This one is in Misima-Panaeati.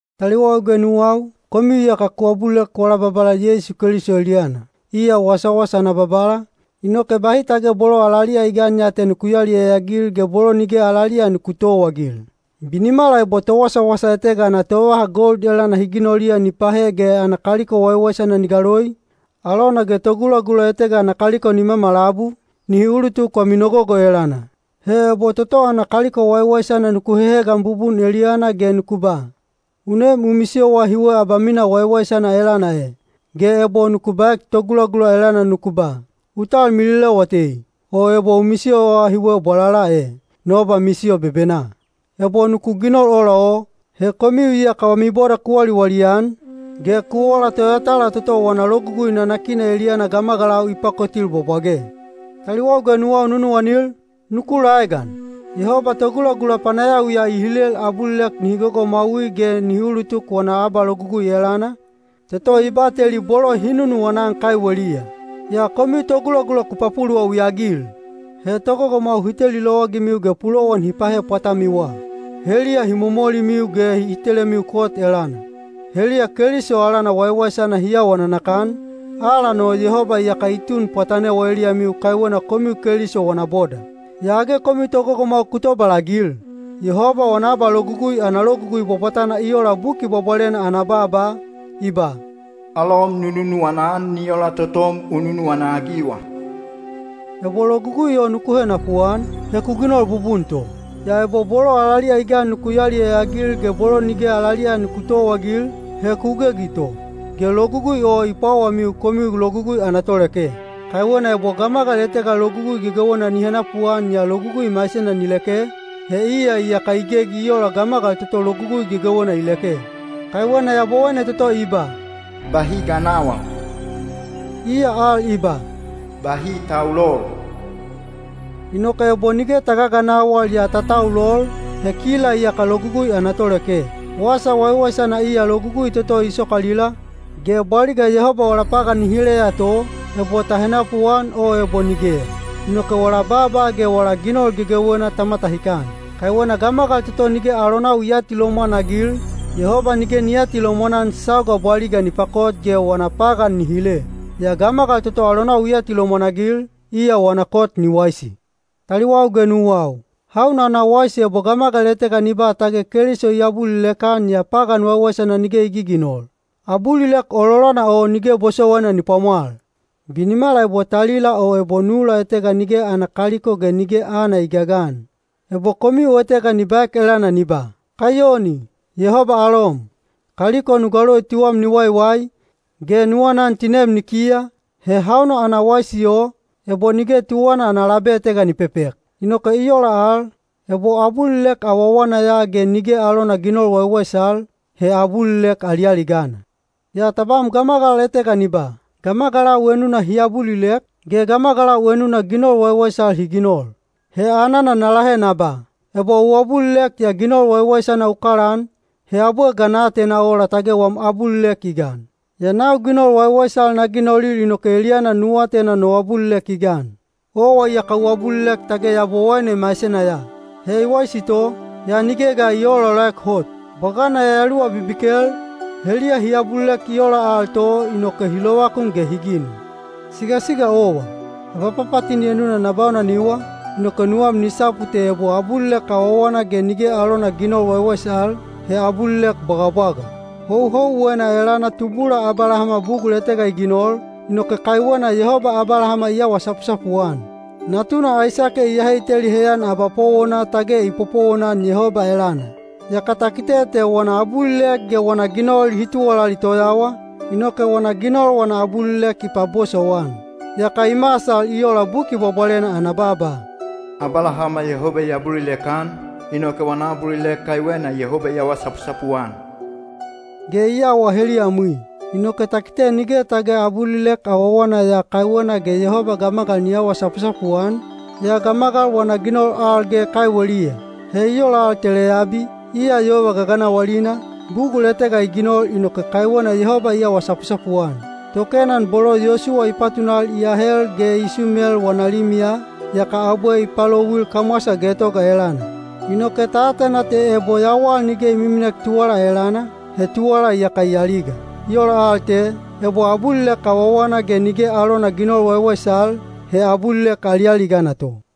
Taliwau ge nuwau, komiu iyaka ku abulilek wala Babala Yeisu Keliso eliyana, iya wasawasa ana Babala, inoke bahi tage bolo alaliya i gan ya te nuku yaliyaya-agil ge bolo nige alaliya yaka nuku towaagil. Binimala ebo towasawasa etega ana tovaha gold elana hi ginoliya ni pahe ge ana kaliko waiwaisana ni galoi, alona ge togulagula etega ana kaliko ni mamalabu, nihi ulutuk wami nogogo elana. He ebo toto ana kaliko waiwaisana nuku hehegan bubun eliyana ge nuku ba, “U nem u misiyowa hiwe abamina waiwaisana elana e,” ge ebo nuku baek togulagula elana nuku ba, “U talmililewa tei, o ebo u misiyowa hiwe bwalala e, no abamisiyo bebenaa,” ebo nuku ginol ola o, he komiu iyaka wami boda ku waliwali-an, ge ku ola toyatala toto wana logugui nanakina eliyana gamagalau i pakotil bwabwage. Taliwau ge nuwau nunuwanil, nuku laegan: Yehoba togulagula panayawiya i hilel abulilek nihi gogomwaui ge nihi ulutuk wana abalogugui elana, toto i bateli bolo hi nunuwana-an kaiweliya. Yaa komiu togulagula ku papuluwawi-agil! He togogomwau hi teli lowagimiu ge pulowan hi pahe pwatamiwa. Heliya hi momolimiu ge hi telemiu kot elana. Heliya Keliso alana waiwaisana hi awa nanakan, alan o Yehoba iyaka i tun pwatanewa eliyamiu kaiwena komiu Keliso wana boda. Yaa age komiu togogomwau ku tobalagil! Yehoba wana abalogugui ana logugui bwabwatana i ola Buki Bwabwalena ana baaba, i ba, “Alom nu nunuwana-an ni ola totom u nunuwana-agiwa.” Ebo logugui o nuku henapuan, he ku ginol bubun to. Yaa ebo bolo alaliya i gan nuku yaliyaya-agil ge bolo nige alaliya nuku towaagil, he ku gegi to, ge logugui o i pwawamiu komiu logugui ana toleke. Kaiwena ebo gamagal etega logugui gegewena ni henapuan yaa logugui maisena ni leke, he iya iyaka i gegi i ola gamagal toto logugui gegewena i leke. Kaiwena Yabowaine toto i ba, “Bahi ganawal,” iya al i ba, “Bahi taulol.” Inoke ebo nige ta gaganawal yaa ta taulol, he kila iyaka logugui ana toleke. Wasa waiwaisana iya logugui toto i sokalila, ge bwaliga Yehoba wala pagan ni hileya to, ebo ta henapuan o ebo nigeya. Inoke wala baaba ge wala ginol gegewena ta matahikan. Kaiwena gamagal toto nige alonau i aatilomwan-agil, Yehoba nige ni aatilomwan-an sauga bwaliga ni pakot ge wana pagan ni hile. Yaa gamagal toto alonau i atilomwan-agil, iya wana kot ni waisi. Taliwau ge nuwau, hauna ana waisi ebo gamagal etega ni ba tage Keliso i abulilek-an yaa pagan waiwaisana nige i giginol? Abulilek ololana o nige bosowaina ni pwamwal. Binimala ebo talila o ebo nula etega nige ana kaliko ge nige aana i gagan. Ebo komiu etega ni baek elana ni ba, “Kaiyoni! Yehoba alom! Kaliko nu galoi tuwam ni waiwai, ge nu anan tinem ni kiya,” he hauna ana waisi o, ebo nige tuwana ana labe etega ni pepek? Inoke i ola al, ebo abulilek awawana ya ge nige alona ginol waiwaisal, he abulilek alialigana. Yaa tabam gamagal etega ni ba, “Gamagalau enuna hi abulilek, ge gamagalau enuna ginol waiwaisal hi ginol.” He anana na lahe na ba, “Ebo u abulilek yaa ginol waiwaisana u kalaan, he abwe ga na atena ola tage wam abulilek i gan? Yaa nau ginol waiwaisal na ginolil inoke eliyana nu atena no abulilek i gan.” Owa iyaka u abulilek tage Yabowaine maisena ya. He i waisi to, yaa nige ga i oolaolaek hot. Bwagana yayaluwa bibikel, heliya hi abulilek i ola al to—inoke hi lovakun ge hi ginu. Sigasiga owa, abapapatini enuna na baunaniwa, inoke nuwam ni sapu te ebo abulilek awawana ge nige alona ginol waiwaisal, he abulilek bwagabwaga. Houhouwena elana tubula Abalahama bugul etega i ginol, inoke kaiwena Yehoba Abalahama i awa sapusapu-an. Natuna Aisake i ahe i teli heyan abapowona tage i popowonan Yehoba elana. Yaka ta kite te wana abulilek ge wana ginol hi tuwalali toyawa, inoke wana ginol wana abulilek i pabosowan. Yaka i masal i ola Buki Bwabwalena ana baaba, “Abalahama Yehoba i abulilek-an, inoke wana abulilek kaiwena Yehoba i awa sapusapu-an,” ge i awa heliyamwi. Inoke ta kite nige tage abulilek awawana ya kaiwena ge Yehoba gamagal ni awa sapusapu-an, yaa gamagal wana ginol al ge kaiweliya. He i ola al te Leyabi, iya yova gaganawalina, bugul etega i ginol inoke kaiwena Yehoba i awa sapusapu-an. Tokenan bolo Yosuwa i patunal i ahel ge i sumel wana limiya, yaka abwe i palouil kamwasa getoga elana. Inoke ta atena te ebo yawal nige i miminek tuwala elana, he tuwala iyaka i aliga. I ola al te, ebo abulilek awawana ge nige alona ginol waiwaisal, he abulilek alialigana to.